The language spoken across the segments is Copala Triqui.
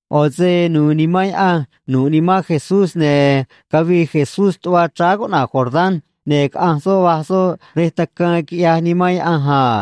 ꞌO̱ se nu̱u̱ Nimán Yaꞌanj nu̱ꞌ nimán Jesús, ne̱ cavii Jesús tuꞌva chráá cuꞌna̱j Jordán, ne̱ caꞌanj soꞌ, va̱j soꞌ rej tacaan, quiꞌyaj Nimán Yaꞌanj a.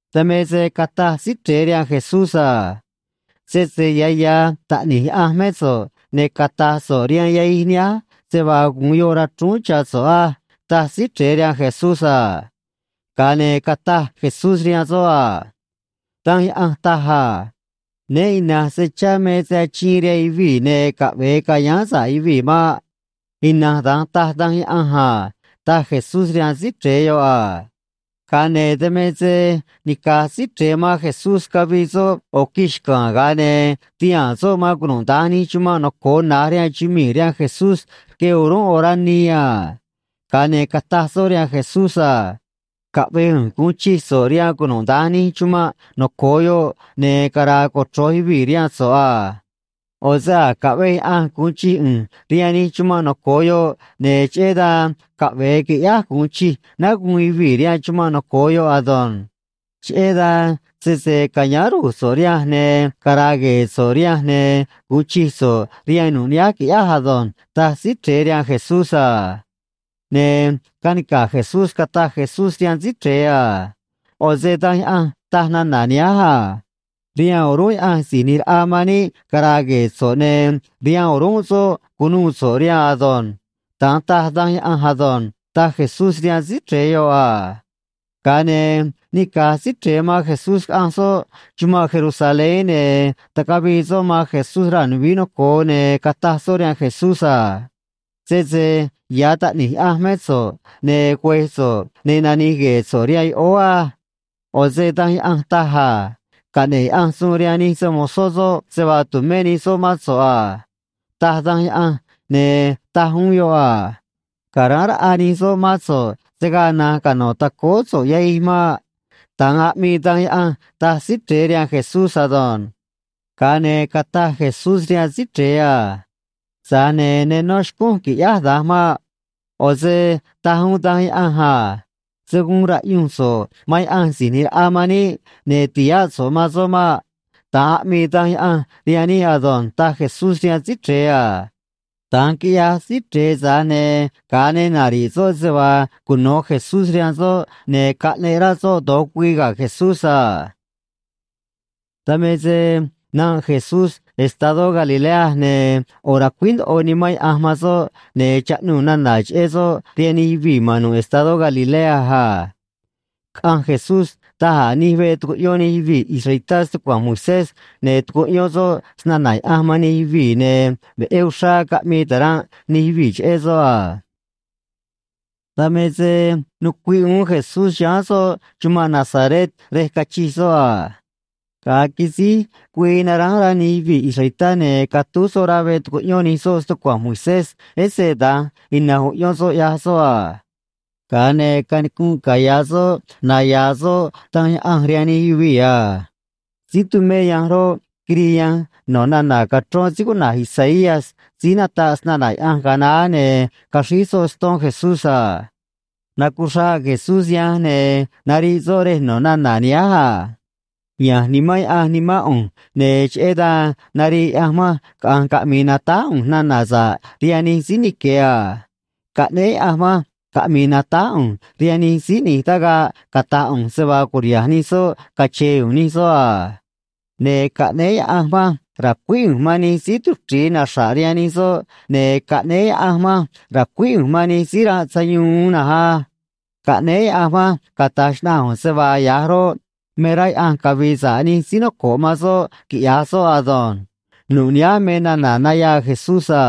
Dan me se cataj Síí Chre̱e rihaan Jesús a: ―Sese ya̱ ya̱ Taꞌni̱j Yaꞌanj mé so̱ꞌ, ne̱ cata̱j so̱ꞌ rihaan yahij nihánj se vaa gu̱un yoꞌ rachrúún cha̱ so̱ꞌ á ―taj Síí Chre̱e rihaan Jesús a. Ga̱a ne̱ cataj Jesús rihaan soꞌ a: ―Danj Yaꞌanj taj a: “Né ina̱nj se chá me se achiin rihaan yuvii̱, ne̱ caꞌve̱e ca̱yáán sa̱ꞌ yuvii̱ maꞌ.” Ina̱nj da̱nj taj Danj Yaꞌanj a ―taj Jesús rihaan Síí Chre̱e yoꞌ a. Ga̱a ne̱ dan me se nica̱j Síí Chre̱e man Jesús cavii soꞌ ꞌo̱ quij xca̱a̱n, ga̱a ne̱ tihaa̱n soꞌ man cunuda̱nj nij chumanꞌ noco̱o na̱j rihaan chumii̱ rihaan Jesús rque o̱rúnꞌ orá nii a. Ga̱a ne̱ cataj soꞌ rihaan Jesús a: ―Caꞌve̱j ꞌu̱nj gu̱un chij so̱ꞌ rihaan cunuda̱nj nij chumanꞌ noco̱o yoꞌ, ne̱ cara̱a̱ cochro̱j yuvii̱ rihaan so̱ꞌ a. ꞌO̱ se a̱j caꞌvej Yaꞌanj gu̱un chij ꞌu̱nj rihaan nij chumanꞌ noco̱o yoꞌ, ne̱ cheꞌé dan caꞌve̱e qui̱ꞌyáj gu̱un chij náá guun yuvii̱ rihaan chumanꞌ noco̱o yoꞌ ado̱nj. Cheꞌé dan sese ca̱yáán ru̱j so̱ꞌ rihanj ne̱ cara̱a̱ gue̱e̱ so̱ꞌ rihanj, ne̱ gu̱un chij so̱ꞌ rihaan nu̱ꞌ nihánj, qui̱ꞌyáj ado̱nj ―taj Síí Chre̱e rihaan Jesús a. Ne̱ canica̱j Jesús cataj Jesús rihaan Síí Chre̱e a: ―ꞌO̱ se Danj Yaꞌanj taj nana̱ nihánj a: “Rihaan o̱rúnꞌ Yaꞌanj Si̱j ꞌNi̱j Raꞌa man níꞌ cara̱a̱ gue̱e̱ so̱ꞌ, ne̱ rihaan o̱rúnꞌ soꞌ cu̱nuû so̱ꞌ rihaan ado̱nj.” Da̱nj taj Danj Yaꞌanj ado̱nj ―taj Jesús rihaan Síí Chre̱e yoꞌ a. Ga̱a ne̱ nica̱j Síí Chre̱e man Jesús caꞌanj soꞌ chumanꞌ Jerusalén, ne̱ tacavii soꞌ man Jesús raa̱ nuvií noco̱o, ne̱ cataj soꞌ rihaan Jesús a: ―Sese ya̱ Taꞌni̱j Yaꞌanj mé so̱ꞌ, ne̱ güe̱j so̱ꞌ, ne̱ nani̱j gue̱e̱ so̱ꞌ rihaan yoꞌóó á. ꞌO̱ se Danj Yaꞌanj taj a: Caꞌne̱ꞌ Yaꞌanj suun rihaan nij se‑mo̱zó soꞌ se vaa tu̱mé nij soꞌ mán so̱ꞌ a, taj Danj Yaꞌanj, ne̱ taj uún yoꞌ a: Ca̱ráán raꞌa nij soꞌ mán so̱ꞌ, se̱ gaa na̱nj cano̱ tacóó so̱ꞌ yahij maꞌ, da̱nj aꞌmii Danj Yaꞌanj ―taj Síí Chre̱e rihaan Jesús ado̱nj. Ga̱a ne̱ cataj Jesús rihaan Síí Chre̱e a: ―Tza̱j ne̱ ne nó xcúnj qui̱ꞌyáj da̱nj maꞌ. ꞌO̱ se taj uún Danj Yaꞌanj a: “Se̱ guun ra̱ꞌyunj so̱ꞌ man Yaꞌanj Si̱j ꞌNi̱j Raꞌa man níꞌ, ne̱ ti̱háꞌ so̱ꞌ man soꞌ maꞌ.” Da̱nj aꞌmii Danj Yaꞌanj rihaan níꞌ ado̱nj ―taj Jesús rihaan Síí Chre̱e a. Da̱nj quiꞌyaj Síí Chre̱e, tza̱j ne̱ ga̱a ne nari̱ꞌ soꞌ se vaa cuno̱ Jesús rihaan soꞌ, ne̱ caꞌneꞌ rá soꞌ do̱j güii ga̱ Jesús a. Dan me se nanꞌ Jesús estadó Galilea, ne̱ ꞌo̱ racuíj ndoꞌo Nimán Yaꞌanj man soꞌ, ne̱ chaꞌnuu̱ nana̱ cheꞌé soꞌ rihaan nij yuvii̱ ma̱n nu̱ꞌ estadó Galilea a. Caꞌanj Jesús da̱j a̱ nij veꞌ tucuꞌyón nij yuvii̱ israelitá stucua̱nj Moisés, ne̱ tucuꞌyón soꞌ snana̱ Yaꞌanj man nij yuvii̱, ne̱ veꞌé uxrá caꞌmii ta̱ranꞌ nij yuvii̱ cheꞌé soꞌ a. Dan me se nucuiꞌ uún Jesús chiháán soꞌ chumanꞌ Nazaret rej cachij soꞌ a. Ga̱a quisíj güii naránj rá nij yuvii̱ israelitá, ne̱ catúj soꞌ rá veꞌ tucuꞌyón nij soꞌ stucua̱nj Moisés, ese da̱nj ina̱nj uꞌyón soꞌ ꞌyaj soꞌ a. Ga̱a ne̱ canicunꞌ caya̱ soꞌ naya̱a̱ soꞌ Danj Yaꞌanj rihaan nij yuvii̱ a. Síí tumé yanj roꞌ, quirii yanj no̱ nana̱ cachrón síí cuꞌna̱j Isaías síí nataꞌ snana̱ Yaꞌanj ga̱a naá, ne̱ caxríj soꞌ ston Jesús a. Nacuchraꞌ Jesús yanj, ne̱ nariꞌ soꞌ rej no̱ nana̱ nihánj a: Ya̱nj Nimán Yaꞌanj nimán ꞌu̱nj, ne̱ cheꞌé dan narii Yaꞌanj manj caꞌa̱nj caꞌmi̱i̱ natáj ꞌu̱nj nana̱ sa̱ꞌ rihaan nij síí nique̱ a. Caꞌnéé Yaꞌanj manj caꞌmi̱i̱ natáj ꞌu̱nj rihaan nij síí ꞌni̱j tagaꞌ cata̱j ꞌu̱nj se vaa cu̱riha̱nj nij soꞌ cache̱e̱ u̱u̱n nij soꞌ a. Ne̱ caꞌnéé Yaꞌanj manj ra̱cuíj ꞌu̱nj man nij síí tuchri̱i naxra̱ꞌ rihaan nij soꞌ, ne̱ caꞌnéé Yaꞌanj manj ra̱cuíj ꞌu̱nj man nij síí ranꞌ sayuun uún na̱nj á. Caꞌnéé Yaꞌanj manj cata̱j xnaꞌanj ꞌu̱nj se vaa ya̱j roꞌ, me rá Yaꞌanj cavi̱i̱ sa̱ꞌ nij síí noco̱ꞌ man soꞌ quiꞌya̱j soꞌ ado̱nj. Nu̱ꞌ nihánj me nana̱ nayaa Jesús a.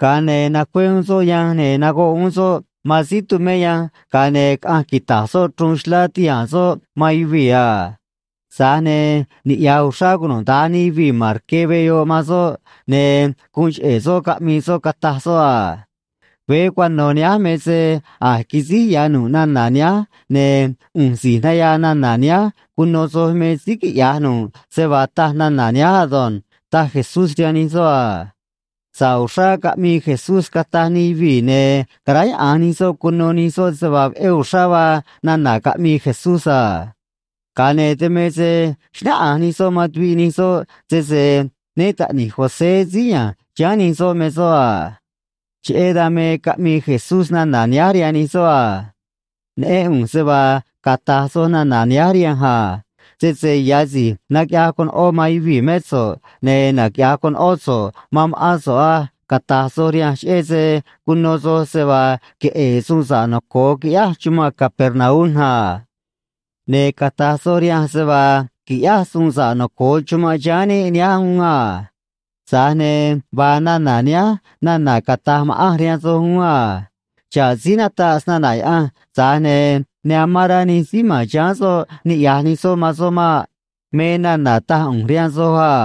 Ga̱a ne̱ nacué uún soꞌ yanj ne̱ nagoꞌ uún soꞌ man síí tumé yanj, ga̱a ne̱ caꞌanj quita̱j soꞌ chruun xlá ti̱haa̱n soꞌ man yuvii̱ a. Tza̱j ne̱ niꞌya̱j uxrá cunuda̱nj nij yuvii̱ ma̱n rque veꞌ yoꞌ man soꞌ, ne̱ guun cheꞌe̱ soꞌ caꞌmii soꞌ, cataj soꞌ a: ―Veé cuano̱ nihánj me se a̱j quisíj ya̱ nu̱ꞌ nana̱ nihánj, ne̱ ꞌu̱nj si̱j nayaa nana̱ nihánj cuno soj me síí quiꞌya̱j nu̱ꞌ se vaa taj nana̱ nihánj ado̱nj ―taj Jesús rihaan nij soꞌ a. Sa̱ꞌ uxrá caꞌmii Jesús, cataj nij yuvii̱, ne̱ caráyaꞌa̱nj nij soꞌ cuno nij soꞌ se vaa veꞌé uxrá vaa nana̱ caꞌmii Jesús a. Ga̱a ne̱ dan me se xnáꞌanj nij soꞌ man tuviꞌ nij soꞌ sese né taꞌni̱j José síí ya̱nj chiháán nij soꞌ me soꞌ a. Cheꞌé dan me caꞌmii Jesús nana̱ nihánj rihaan nij soꞌ a: ―Neꞌén ꞌu̱nj se vaa cata̱j soj nana̱ nihánj rihanj a: “Sese ya̱ si̱j naquiꞌyaj conoꞌó man yuvii̱ mé so̱ꞌ, ne̱ naquiꞌya̱j conoꞌó so̱ꞌ man ma̱ꞌán so̱ꞌ á”, cata̱j soj rihanj cheꞌé se cuno soj se vaa queꞌe̱e̱ suun sa̱ꞌ noco̱o quiꞌyáj chumanꞌ Capernaum a. Ne̱ cata̱j soj rihanj se vaa qui̱ꞌyáj suun sa̱ꞌ noco̱o chumanꞌ chiháán níꞌ nihánj uún a. Tza̱j ne̱ vaa nana̱ nihánj nana̱ cata̱j ma̱ꞌanj rihaan soj uún a: “Xa̱ꞌ síí nataꞌ snana̱ Yaꞌanj, tza̱j ne̱ ne amán rá nij síí ma̱n chiháán soꞌ niꞌya̱j nij soꞌ man soꞌ maꞌ”, me nana̱ taj ꞌu̱nj rihaan soj a.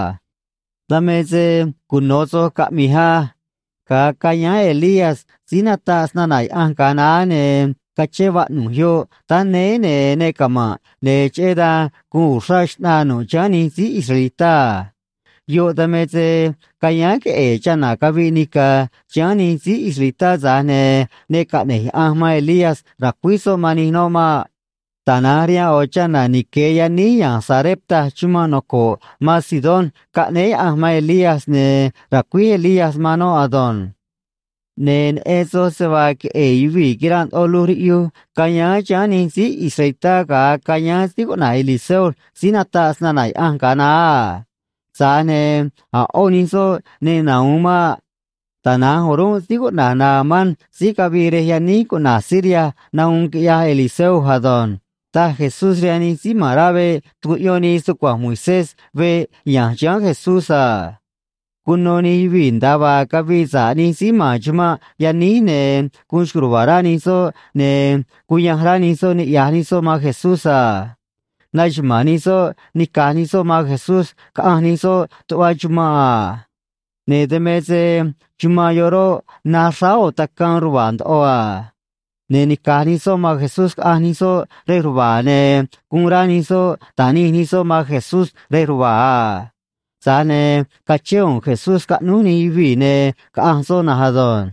’Dan me se cuno̱ soj caꞌmi̱j á. Ga̱a cayáán Elías síí nataꞌ snana̱ Yaꞌanj ga̱a naá, ne̱ cachén vaꞌnu̱j yoꞌ táá néé, ne̱ ne cama̱nꞌ, ne̱ cheꞌé dan guun uxrá xꞌnaa nu̱ꞌ chiháán nij síí israelitá a. Yoꞌ dan me se cayáán queꞌe̱e̱ chana̱ caviꞌ nica̱ chiháán nij síí israelitá, tza̱j ne̱ ne caꞌne̱j Yaꞌanj man Elías ra̱cuíj soꞌ man nij noꞌ maꞌ. Tana̱nj rihaan ꞌo̱ chana̱ nique̱ yaníj ya̱nj Sarepta chumanꞌ noco̱ꞌ man Sidón caꞌnéé Yaꞌanj man Elías, ne̱ racuíj Elías man noꞌ ado̱nj. ’Ne̱ neꞌen soj se vaa queꞌe̱e̱ yuvii̱ quiranꞌ ndoꞌo luj riꞌyuj cayáán chiháán nij síí israelitá ga̱a cayáán síí cuꞌna̱j Eliseo síí nataꞌ snana̱ Yaꞌanj ga̱a naá a. Tza̱j ne̱ a̱ ꞌó nij soꞌ ne nahu̱un maꞌ. Tana̱nj o̱rúnꞌ síí cuꞌna̱j Naamán síí cavii rej yaníj cuꞌna̱j Siria nahuun, quiꞌyaj Eliseo ado̱nj ―taj Jesús rihaan nij síí ma̱n rá veꞌ tucuꞌyón nii stucua̱nj Moisés veꞌ ya̱nj chiháán Jesús a. Cuno nij yuvii̱ nda̱a vaa cavii sa̱ꞌ nij síí ma̱n chumanꞌ yaníj, ne̱ guun xco̱j ruva̱a̱ rá nij soꞌ, ne̱ cuyanj rá nij soꞌ niꞌya̱j nij soꞌ man Jesús a. Naxuma̱a̱n nij soꞌ nica̱j nij soꞌ man Jesús caꞌanj nij soꞌ tuꞌva chumanꞌ a. Ne̱ dan me se chumanꞌ yoꞌ roꞌ, naj xráá ꞌo̱ tacaan ruva̱a̱ ndoꞌo a. Ne̱ nica̱j nij soꞌ man Jesús caꞌanj nij soꞌ rej ruva̱a̱, ne̱ guun rá nij soꞌ ta̱nij nij soꞌ man Jesús rej ruva̱a̱ a. Tza̱j ne̱ cachén u̱u̱n Jesús scaꞌnúj nij yuvii̱, ne̱ caꞌanj soꞌ na̱nj ado̱nj.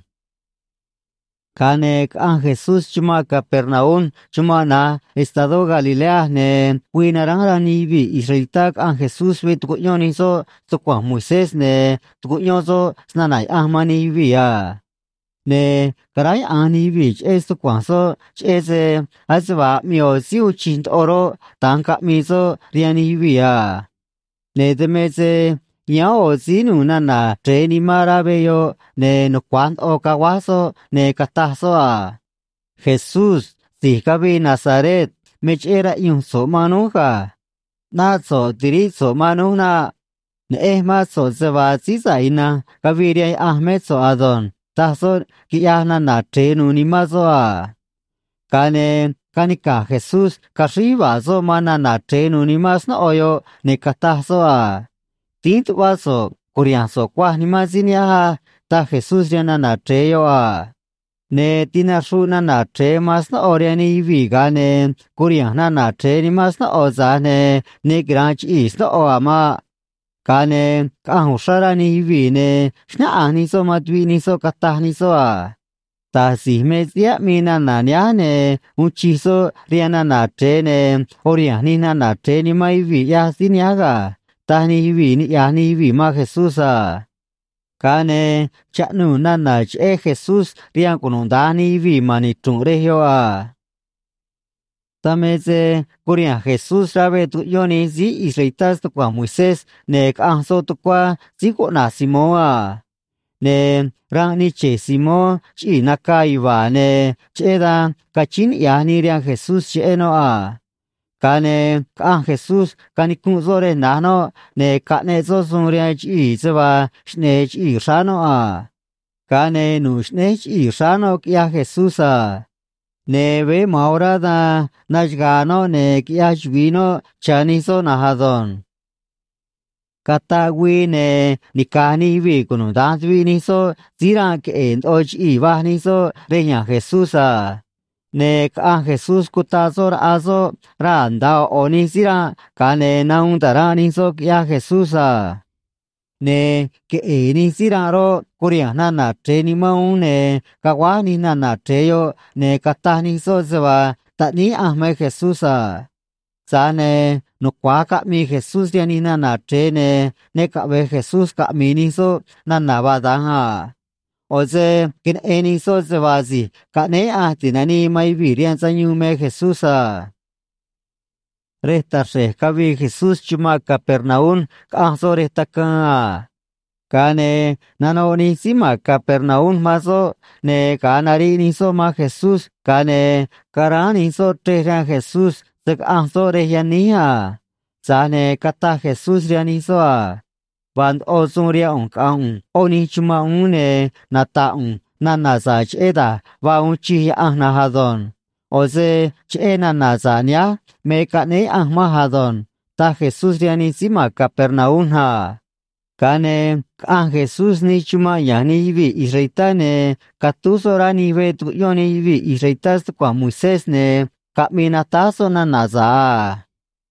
Ga̱a ne̱ caꞌanj Jesús chumanꞌ Capernaum chumanꞌ na̱j estadó Galilea, ne̱ güii naránj rá nij yuvii̱ israelitá caꞌanj Jesús veꞌ tucuꞌyón nij soꞌ stucua̱nj Moisés, ne̱ tucuꞌyón soꞌ snana̱ Yaꞌanj man nij yuvii̱ a. Ne̱ caráyaꞌa̱nj nij yuvii̱ cheꞌé stucua̱nj soꞌ, cheꞌé se ase vaa aꞌmii ꞌo̱ síí uun chij ndoꞌo roꞌ, da̱nj caꞌmii soꞌ rihaan nij yuvii̱ a. Ne̱ dan me se yáán ꞌo̱ síí nu̱u̱ nana̱ chre̱e nimán rá veꞌ yoꞌ, ne̱ nucua̱j ndoꞌo caguáj soꞌ, ne̱ cataj soꞌ a: ―Jesús si̱j cavii Nazaret, me cheꞌé raꞌyunj so̱ꞌ man núj ga̱. ꞌNáꞌ so̱ꞌ ti̱ríꞌ so̱ꞌ man núj naꞌ. Neꞌenj mán so̱ꞌ se vaa Síí Sa̱ꞌ Ina̱nj cavii rihaan Yaꞌanj mé so̱ꞌ ado̱nj ―taj soꞌ quiꞌyaj nana̱ chre̱e nu̱u̱ nimán soꞌ a. Ga̱a ne̱ canica̱j Jesús caxríj yuva̱a̱ soꞌ man nana̱ chre̱e nu̱u̱ nimán snóꞌo yoꞌ, ne̱ cataj soꞌ a: ―Dínj tuꞌvá so̱ꞌ cu̱riha̱nj so̱ꞌ cuaj nimán síí nihánj á ―taj Jesús rihaan nana̱ chre̱e yoꞌ a. Ne̱ tinaxruꞌ nana̱ chre̱e man snóꞌo rihaan nij yuvii̱, ga̱a ne̱ curiha̱nj nana̱ chre̱e nimán snóꞌo, tza̱j ne̱ ne quira̱nꞌ chiꞌii̱ snóꞌo a̱ maꞌ. Ga̱a ne̱ caꞌanj uxrá rá nij yuvii̱, ne̱ xnáꞌanj nij soꞌ man tuviꞌ nij soꞌ, cataj nij soꞌ a: ―Da̱j si̱j me síí aꞌmii nana̱ nihánj, ne̱ uun chij soꞌ rihaan nana̱ chre̱e, ne̱ uriha̱nj nij nana̱ chre̱e nimán yuvii̱ ꞌyaj síí nihánj ga̱ ―taj nij yuvii̱ niꞌya̱j nij yuvii̱ man Jesús a. Ga̱a ne̱ chaꞌnuu̱ nana̱ cheꞌé Jesús rihaan cunuda̱nj nij yuvii̱ ma̱n nichru̱nꞌ rej yoꞌ a. Dan me se curiha̱nj Jesús rá veꞌ tucuꞌyón nij síí israelitá stucua̱nj Moisés, ne̱ caꞌanj soꞌ tucuá síí cuꞌna̱j Simón a. Ne̱ ranꞌ nii che̱j Simón chiꞌii̱ nacaa yuva̱a̱, ne̱ cheꞌé dan cachíín niꞌya̱j nii rihaan Jesús cheꞌé noꞌ a. Ga̱a ne̱ caꞌanj Jesús canicunꞌ soꞌ rej na̱j noꞌ, ne̱ caꞌneꞌ soꞌ suun rihaan chiꞌii̱ se vaa xꞌne̱e̱ chiꞌii̱ xráá noꞌ a. Ga̱a ne̱ nu̱ꞌ xꞌnéj chiꞌii̱ xráá noꞌ, quiꞌyaj Jesús a. Ne̱ veé ma̱an orá dan naxaga̱a̱ noꞌ, ne̱ quiꞌyaj chuvi̱i noꞌ cha̱ nij soꞌ na̱nj ado̱nj. Cataꞌ güii, ne̱ nica̱j nij yuvii̱ cunuda̱nj tuviꞌ nij soꞌ síí ranꞌ queꞌe̱e̱ ndoꞌo chiꞌii̱, va̱j nij soꞌ rej ya̱nj Jesús a. Ne̱ caꞌanj Jesús, cutaꞌ soꞌ raꞌa soꞌ raa̱ nda̱a ꞌo̱ ꞌo̱ nij síí ranꞌ, ga̱a ne̱ nahuun ta̱ranꞌ nij soꞌ, quiꞌyaj Jesús a. Ne̱ queꞌe̱e̱ nij síí ranꞌ roꞌ, curiha̱nj nana̱ chre̱e nimán uún, ne̱ caguáj nij nana̱ chre̱e yoꞌ, ne̱ cataj nij soꞌ se vaa Taꞌníí Yaꞌanj me Jesús a. Tza̱j ne̱ nucua̱j caꞌmii Jesús rihaan nij nana̱ chre̱e, ne̱ ne caꞌve̱j Jesús caꞌmi̱i̱ nij soꞌ nana̱ vaa da̱nj a. ꞌO̱ se queneꞌen nij soꞌ se vaa Si̱j Caꞌnéé Yaꞌanj Ti̱nanii man Yuvii̱ rihaan Sayuun me Jesús a. Rej taxre̱j cavii Jesús chumanꞌ Capernaum caꞌanj soꞌ rej tacaan a. Ga̱a ne̱ nanoꞌ nij síí ma̱n Capernaum man soꞌ, ne̱ ga̱a nariꞌ nij soꞌ man Jesús, ga̱a ne̱ caráán nij soꞌ chrej rihaan Jesús se̱ caꞌanj soꞌ rej yaníj a. Tza̱j ne̱ cataj Jesús rihaan nij soꞌ a: ―Vaa ndoꞌo suun rihaan ꞌu̱nj caꞌa̱nj ꞌu̱nj ꞌó nij chumanꞌ uún, ne̱ nata̱ꞌ ꞌu̱nj nana̱ sa̱ꞌ cheꞌé da̱j vaa uun chij Yaꞌanj na̱nj ado̱nj. ꞌO̱ se cheꞌé nana̱ sa̱ꞌ nihánj me caꞌnéé Yaꞌanj manj ado̱nj ―taj Jesús rihaan nij síí ma̱n Capernaum a. Ga̱a ne̱ caꞌanj Jesús nij chumanꞌ ya̱nj nij yuvii̱ israelitá, ne̱ catúj soꞌ rá nij veꞌ tucuꞌyón nij yuvii̱ israelitá stucua̱nj Moisés, ne̱ caꞌmii natáj soꞌ nana̱ sa̱ꞌ a.